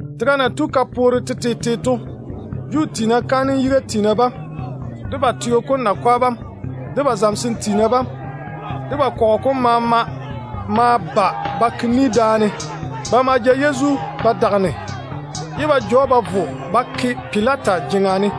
Tega na tu ka poore tetete to, Juu tiina kaanem yiga tiina bam, de ba teo kom nakwa bam, de ba zamesem tiina bam, de ba kɔgɔ kom maama ma ba ba ke ni daane. Ba ma ja Yezu ba vɔ, ye ba ja‑o ba vo ba ke Pilata jeŋa ne.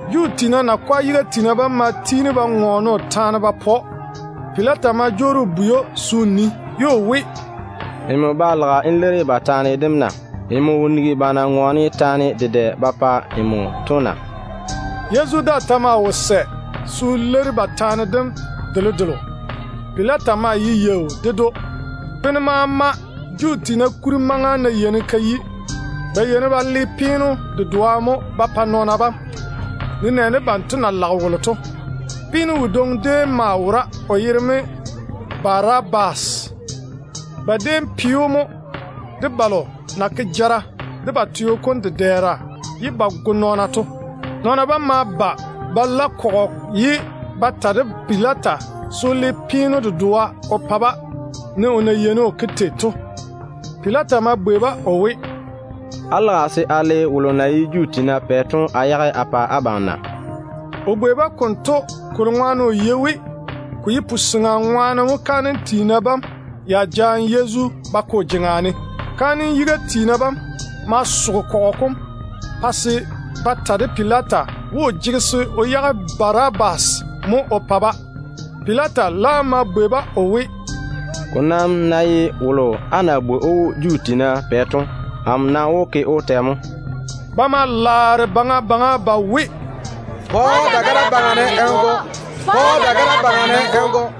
Juu tiina kaanem yiga tiina bam ma tiini ba ŋɔɔne o taane ba pa‑o. Pilata ma jwoori o bwei‑o se o nii, ye o we, “Nmo ba lage n leiri ba taane dem na? Nmo wo nigi ba na ŋɔɔne kolo maama ba pa nmo to na?” Yezu daa ta maa wo sɛ se o leiri ba taane dem delodelo. Pilata maa ye yaau ded‑o. Bene maama Juu tiina kuri maŋa ná yeini ka yi, ba yeini ba le peeno dedoa mo ba pa nɔɔna bam, nenɛɛne banto na lage wolo to. Peeno wodwoŋi déem maa wora, o yere mo Barabas. Ba déem pe‑o mo de balo na dwoni de ba teo kom dedɛɛra ye ba go nɔɔna to. Nɔɔna bam ma ba ba la kɔgɔ ye ba daare ba ta de Pilata se o le peeno dedoa o pa-ba ne o na yeini o ke tei to. Pilata ma bwei-ba o we, “Á lage se a le wolo na ye Juu tiina pɛ to a yage a pa abam na?” O bwei-ba konto kolo ŋwaane o yei we ko ye wo-goo ŋwaane mo kaanem yiga tiina bam ya jaane Yezu ba ke o jeŋa ne. Kaanem yiga tiina bam ma soge kɔgɔ kom pa se ba ta de Pilata we, o jege se o yage Barabas mo o pa-ba. Pilata laam ma bwei-ba o we, “Ko nam ná ye wolo á na bwoi‑o we Juu tiina pɛ to, amo nam wó ke‑o tɛ mo?” Ba ma laare baŋa baŋa ba we, “Pa‑o dagara yuu ne n go.”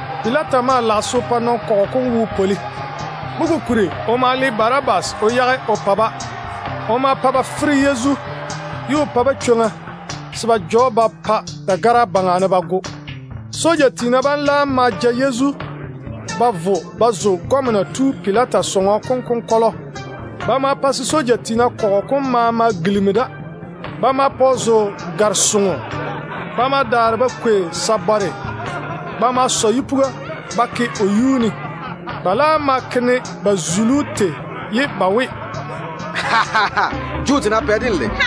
Pilata maa lage se o pa kɔgɔ kom bochare zuri mo. Mo kokuri o ma le Barabas o yage o pa-ba. O ma pa ba fere Yezu, ye o pa-ba chwoŋa se ba ja‑o ba pa dagara yuu ne ba go. Soja tiina bam laam ma ja Yezu ba vo ba zo gɔmena tu Pilata sɔŋɔ kom konkɔlɔ ye ba daare ba la ba kɔgɔ kom maama ba ke daane. Ba ma pa Yezu zo gare-soŋo. Ba ma daare ba kwei sabare ba ma sɔ yipuga ba pu o yuu ne. Ba laam ma seini‑o ba we, “Juu tiina pɛ, denlei.”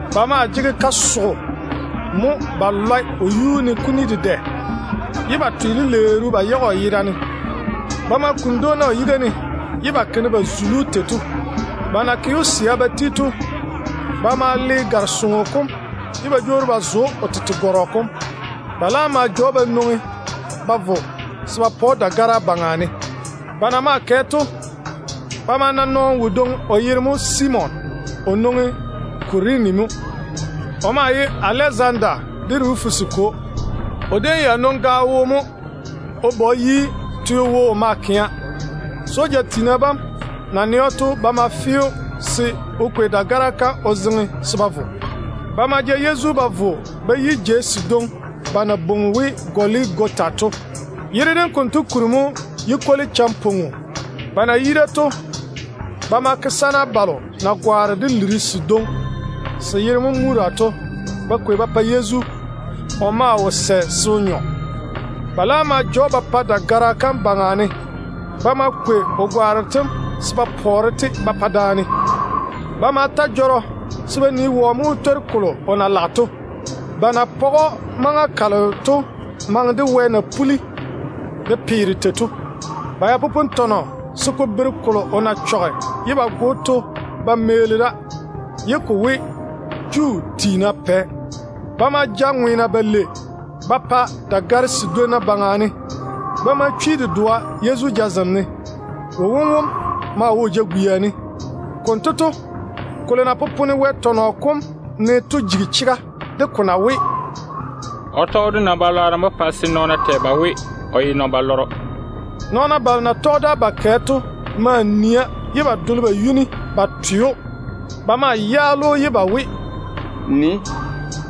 Ba maa jege kasogo ba lɔe o yuu ne kuni dedɛ, ye ba twe lileeru ba yage o yera ne. Ba ma kuni dwoona o yiga ne ye ba ke ne ba na zuli‑o tei to. Ba na ke‑o ba mɔne ba ti to, ba ma le gare-soŋo kom ye ba jwoori ba zo‑o o tete gɔrɔ kom. Ba laam ma ja‑o ba nwoŋi ba vo se ba pa‑o dagara kam yuu ne. Ba na maa kɛ to, ba ma na nɔɔno wodwoŋi, o yere mo Simon. O nwoŋi Kurene mo. O maa ye Alezanda de Rufus kwo. O déem ya nwoŋi kara mo o ba o yi teo wo o maa kɛa. Soja tiina bam na nɛ‑o to, ba ma fe‑o se o kwei dagara kam o zeŋe se ba vo. Ba ma ja Yezu ba vo ba yi jeiga kadwoŋi ba na bwoi we ‘Goligota’ to. Yere dem konto kuri mo ye ‘Yu-kwoli-champoa Peo’. Ba na yi da to, ba ma kwei liri sedwoŋi se yere na ye Mura to ba guuri sana wone ba pa Yezu. O maa wo sɛ se o nyɔ. Ba laam ma ja‑o ba pa dagara kam yuu ne. Ba ma kwei o gwaaro tem se ba pɔɔre-te ba pa daane. Ba ma ta jɔrɔ se ba nii wɔ mo wó twori kolo o na lage to. Ba na page‑o maŋa kalo to maŋe de wɛ na puli de peere tei to. Ba ya popone tɔnɔ se ko bere kolo o na chɔge ye ba go‑o to ba meeli da, ye ko we, JUU TIINA PƐ. Ba ma ja ŋweena balei ba pa dagare sedwonna baŋa ne. Ba ma chwi dedoa Yezu jazem ne. Wowom maa wo o jagwia ne. [ Konto to, kolo na popone Wɛ tɔnɔ kom ne to jigi chega de ko na we, “O tɔge de nɔn-balwaaro mo pa se nɔɔna tɛ ba we o ye nɔn-balɔrɔ.”] Nɔɔna balo na tɔge da ba kɛ to maa nia ye ba dole ba yuni ba twe‑o. Ba ma yaale‑o ye ba we, “Nii!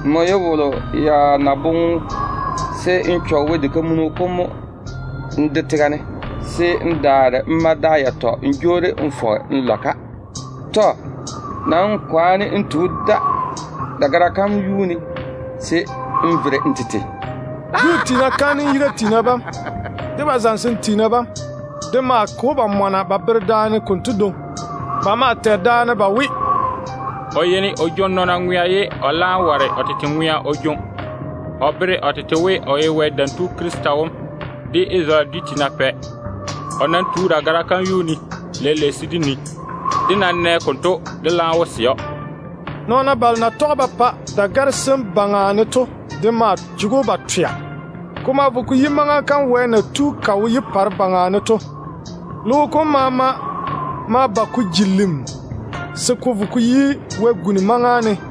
Nmo ye wolo ya na boŋe se n yigi Wɛ diga kam mo n de tega ne, se n daare n ma da yatɔ n jwoori n fɔge n lɔ-ka. Tɔ. Kwaane n tu da dagara kam yuu ne se n vere n tete.” Juu tiina kaanem yiga tiina bam de ba zamesem tiina bam de maa ke‑o ba mɔna ba bere daane konto dwoŋi. Ba maa tɛ daane ba we, “O yeini o jwoŋi nɔɔna ŋwea, ye o laam ware o tete ŋwea o jwoŋi. O bere o tete we o ye Wɛ Dam Tu Krista wom, de Isarele dwi tiina pɛ. O nam tu dagara kam yuu ne leile se dé nii. Dé ná nɛ konto, dé wó sɛ we o ye chega tu.” Nɔɔna balo ba na tɔge ba pa dagare sem baŋa ne to de maa jege‑o ba twea. Ko ma vo ko yi maŋa kam wɛ na tu de wo yupare baŋa ne to. Tega kam maama ma ba ka ji lim se ko vo ko yi wɛ-guni maŋa ne.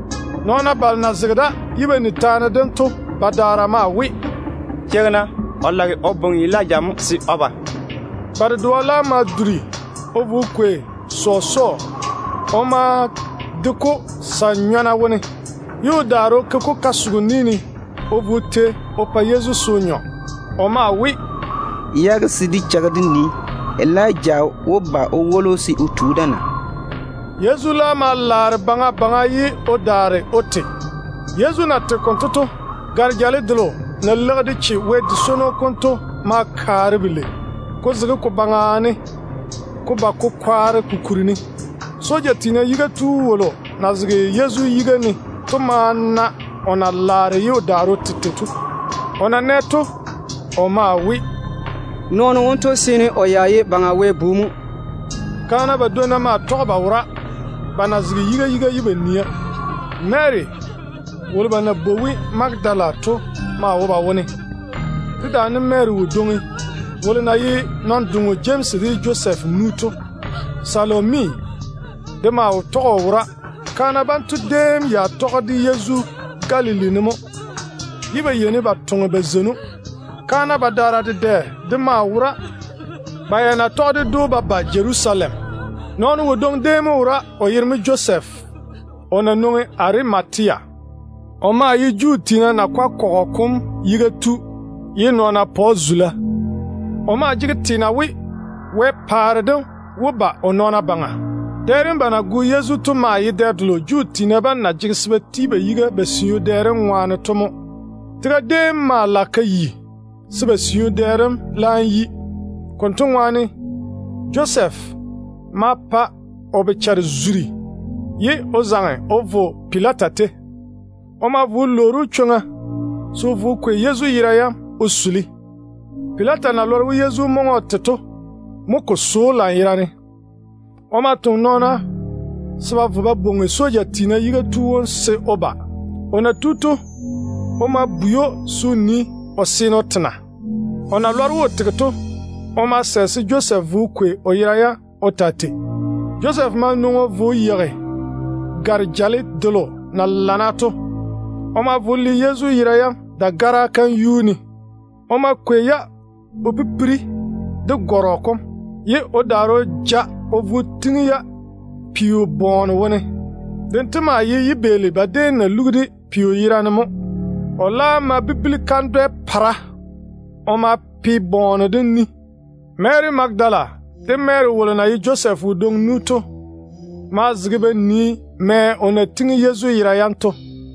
Nɔɔna balo na zege da ye ba ni taane dem to badaara maa we, “Cheigi-na! O lage o bwoŋi Elija mo se o ba.” Ba dedoa laam ma duri o vo o kwei sɔsɔɔ. O ma de-ko sa-nyɔna wone, ye o daare o ke-ko kasogo ni ne o vo o tei o pa Yezu se o nyɔ. O maa we, “Yage se dé cheigi dé nii, Elija wó ba o woli‑o se o tu da na?” Yezu laam ma laare baŋa baŋa ye o daare o te. Yezu na tege konto to, gare-jale delo na leigi de che Wɛ di-yun-gala kam to ma kaare belei, ko zege ko baŋa ne ko tu ko kwaare ko kuri ne. Soja tiina yiga tu wolo na zege Yezu yiga ne to ma na o na tega tei to. O na nɛ to, o maa we, “Nɔɔno wonto ya seene o ye Baŋa Wɛ Bu mo.” Kaana badwonna maa tɔge ba wora, ba na zege yiga yiga ye ba nia. Mary wolo ba na bwoi we Magadala to maa wo ba wone, dedaane Mary wodwoŋi wolo na ye nɔn-doŋo Jemsi de Josɛf nu to. Salomi de maa tɔge o wora. Kaana banto déem ya tɔge de Yezu Galili ne mo, ye ba yeini ba toŋe ba zeini‑o. Kaana badaara dedɛ de maa wora, ba ya na tɔge ded‑o ba ba Jerusalem. Nɔɔno wodwoŋi déem mo wora, o yere mo Josef, o na nwoŋi Arimatea. O maa ye Juu tiina nakwa kɔgɔ kom yiga tu, ye nɔɔna pa‑o zula. O maa jege teena we Wɛ paare dem wó ba o nɔɔna baŋa. Dɛ dem ba na go Yezu to maa ye dɛ delo Juu tiina bam na jege se ba ti ba yiga ba siu dɛ dem ŋwaane to mo. Tega déem ma lage ka yi se ba siu dɛ dem laam yi. Konto ŋwaane Josɛf ma pa o bochare zuri ye o zaŋe o vo Pilata tei. O ma vo o lwoori‑o chwoŋa se o vo o kwei Yezu yera yam o suli. Pilata na lɔre we Yezu maŋe o te to mo ko so‑o lanyerane. O ma toŋe nɔɔna se ba vo ba bwoŋi soja tiina yiga tu wom se o ba. O na tu to, o ma bwei‑o se o nii, Yezu seene o te na. O na lɔre we o tege to, o ma sɛ se Josɛf vo o kwei o yera yam o taa tei. Josɛf ma nwoŋi o vo o yeigi gare-jale delo na lana to. O ma vo o pare Yezu yera yam dagara kam yuu ne. O ma kwei-ya o pipiri de gɔrɔ kom, ye o daare o ja-ya o vo o tiŋi peo bɔɔne wone. Dento maa ye yibeeli ba déem na luga peo yera ne mo. O laam ma bibili kandwɛ-polɔgɔ o ma pe bɔɔne dem ni. Mary Magadala de Mary wolo na ye Josɛf wodwoŋi nu to maa zege ba nii mɛ o na tiŋi Yezu yera yam to.